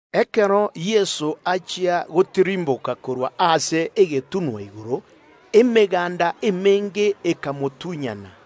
Ekero Yeso achia gotirimboka korwa ase egetunwa igoro, emeganda emenge ekamotunyana.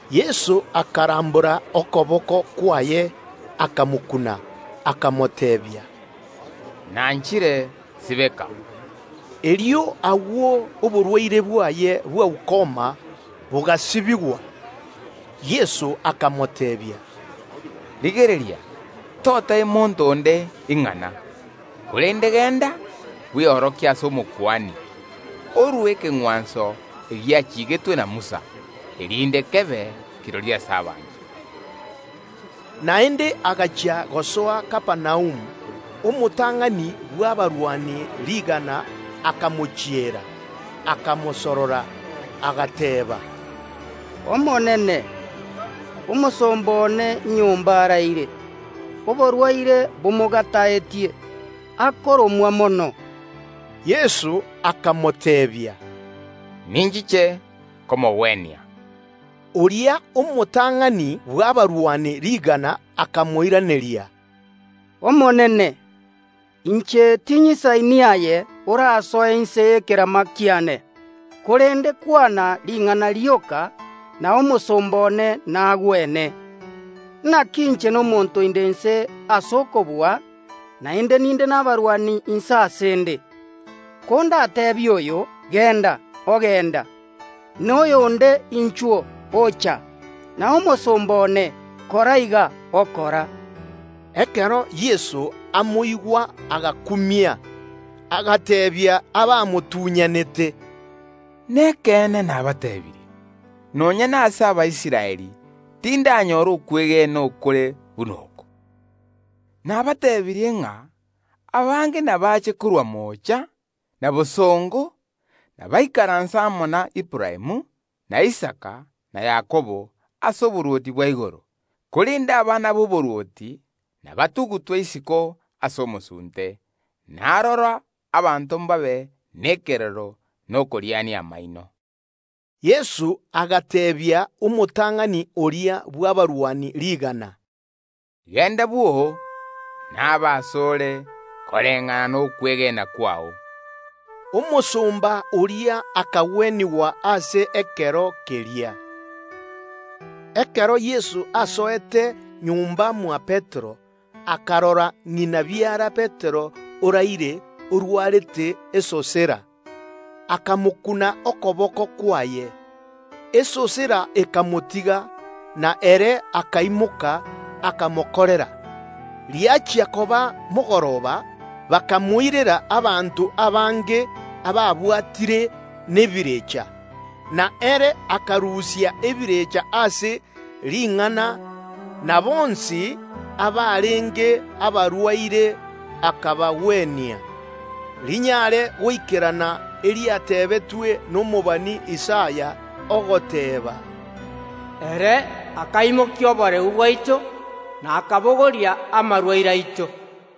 Yeso akarambora okoboko kwaye, akamokuna, akamoteebia, “Nanchire; sibeka.” Erio agwo oborwaire bwaye bwa ukoma bogasibigwa. Yeso akamoteebia, “Rigereria, toteebia monto onde ing’ana; korende genda, bweorokie ase Omokuani, orue ekeng’wanso egiachigetwe na Musa, erinde kebe kirori ase abanto.” Ekero Yeso achia gosoa Kapernaumu, omotang’ani bw’abarwani rigana akamochiera, akamosorora, agateeba, “Omonene, omosomba one nyomba araire, oborwaire bomogataetie, akoromwa mono.” Yeso akamoteebia, “Ninchiche komogwenia.” Oria omotang’ani bw’abarwani rigana akamoiraneria, “Omonene, inche tinyisaini aye orasoe inse y’ekerama kiane; korende kwana ring’ana rioka, na omosomba one nagwene. Inaki inche nomonto inde inse ase okobua, naende ninde nabarwani inse ase ’nde. Kondateebie oyo: Genda, ogenda; na oyonde: Inchuo, ocha; na omosomba one: Kora iga, okora.” Ekero Yeso amoigwa agakumia, agateebia abamotunyanete, “Nekeene nabateebirie: Nonya nase Abaisraeli tindanyora okwegena okore buna oko. Nabatebirie ng’a abange nabache korwa moocha na bosongo, ’nabaikaranse ase emesa na koria amo na Aburaamu, na Isaka, na Yakobo, ase oborwoti bwa igoro, korende abana b’oborwoti ’nabatugutwe isiko ase omosunte; na aroro abanto mbabe nekerero na okoriania amaino.” Yeso agateebia omotang’ani oria bw’abarwani rigana, “Genda bwoo, nabe ase ore koreng’ana nokwegena kwao.” Omosomba oria akagwenigwa ase ekero keria. Ekero Yeso asoete nyomba mwa Petero, akarora ng’ina biara Petero oraire, orwarete esosera. Akamokuna okoboko kwaye. Esosera ekamotiga, na ere akaimoka akamokorera. Riachia koba mogoroba, bakamoirera abanto abange ababwatire nebirecha, na ere akarusia ebirecha ase ring’ana, na bonsi abarenge abarwaire akabagwenia; rinyare goikerana eriatebetwe nomobani Isaya, ogoteeba, “Ere akaimokia oboreu bwaito, na akabogoria amarwaire aito.”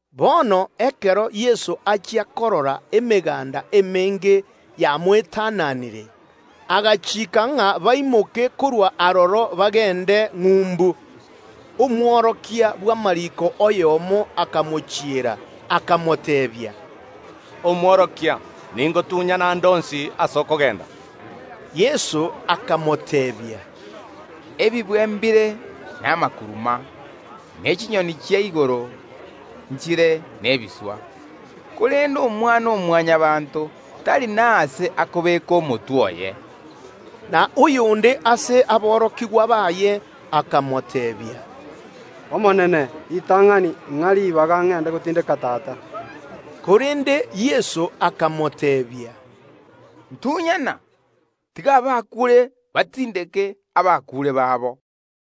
Bono ekero Yeso achia korora emeganda emenge yamoetananire, agachiika ng’a baimoke korwa aroro bagende ng’umbu. Omworokia oyomo bw’amariiko akamochiera, akamoteebia, “Omworokia, ningotunyane aande onsi ase okogenda.” Yeso akamoteebia, “Ebibwe mbire namakuruma, ne chinyoni chia igoro nchire nebiswa, korende Omwana‐o‐Mwanyabaanto tari nase akobeeka omotwe oye.” Na oyonde ase aborokigwa baye akamoteebia, “Omonene, ritang’ani ing’a ribaga ngende gotindeka tata” Korende Yeso akamoteebia, “Ntunyana, tiga abakuure batindeke abakuure babo.”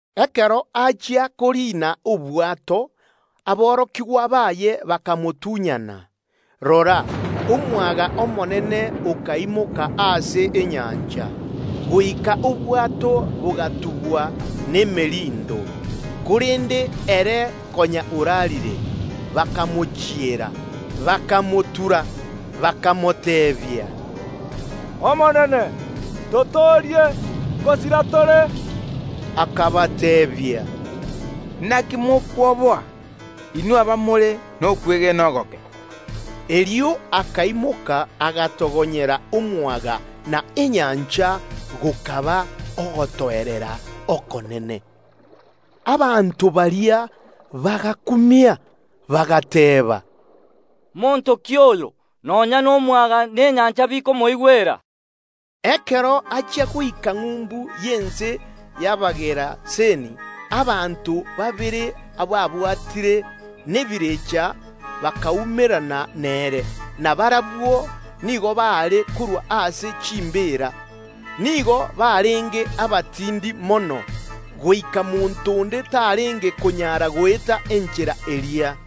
Ekero Yeso achia koriina obwato, aborokigwa baye bakamotunyana. Rora, omwaga omonene okaimoka ase enyancha, goika obwato bogatubwa nemerindo; korende ere konya oraarire. Bakamochiera, bakamotura, bakamoteebia, “Omonene, totoorie, ngosira tore!” Yeso akabateebia, “Inaki mokwoboa, inwe abamore nokwegena ogoke?” Erio akaimoka, agatogonyera omwaga na enyancha; gokaba ogotoerera okonene. Abanto baria bagakumia, bagateeba, “Monto ki oyo, nonya nomwaga na enyancha bikomoigwera?” Ekero achia goika ng’umbu y’ense y’Abageraseni, abanto babere ababwatire nebirecha bakaumerana nere, na barabwo nigo baare korwa ase chimbeera, nigo barenge abatindi mono, goika monto onde tarenge konyara goeta enchera eria.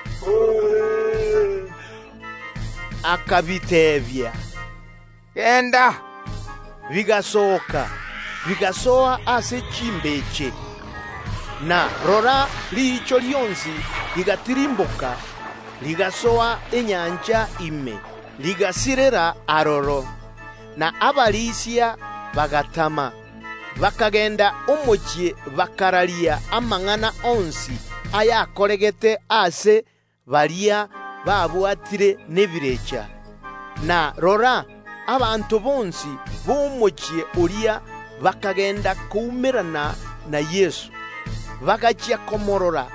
Yeso akabiteebia, “Genda!” Bigasooka, bigasoa ase chimbeche. Na rora, riicho rionsi rigatirimboka, rigasoa enyancha ime, rigasirera aroro. Na abarisia b’echimbeche chiria bagatama, bakagenda omochie bakararia amang’ana onsi ayakoregete ase baria babwatire nebirecha. Na rora, abanto bonsi b’omochie oria bakagenda koumerana na Yeso; bagachia komoorora,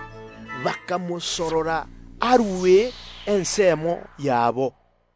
bakamosorora arue orogongo rwabo.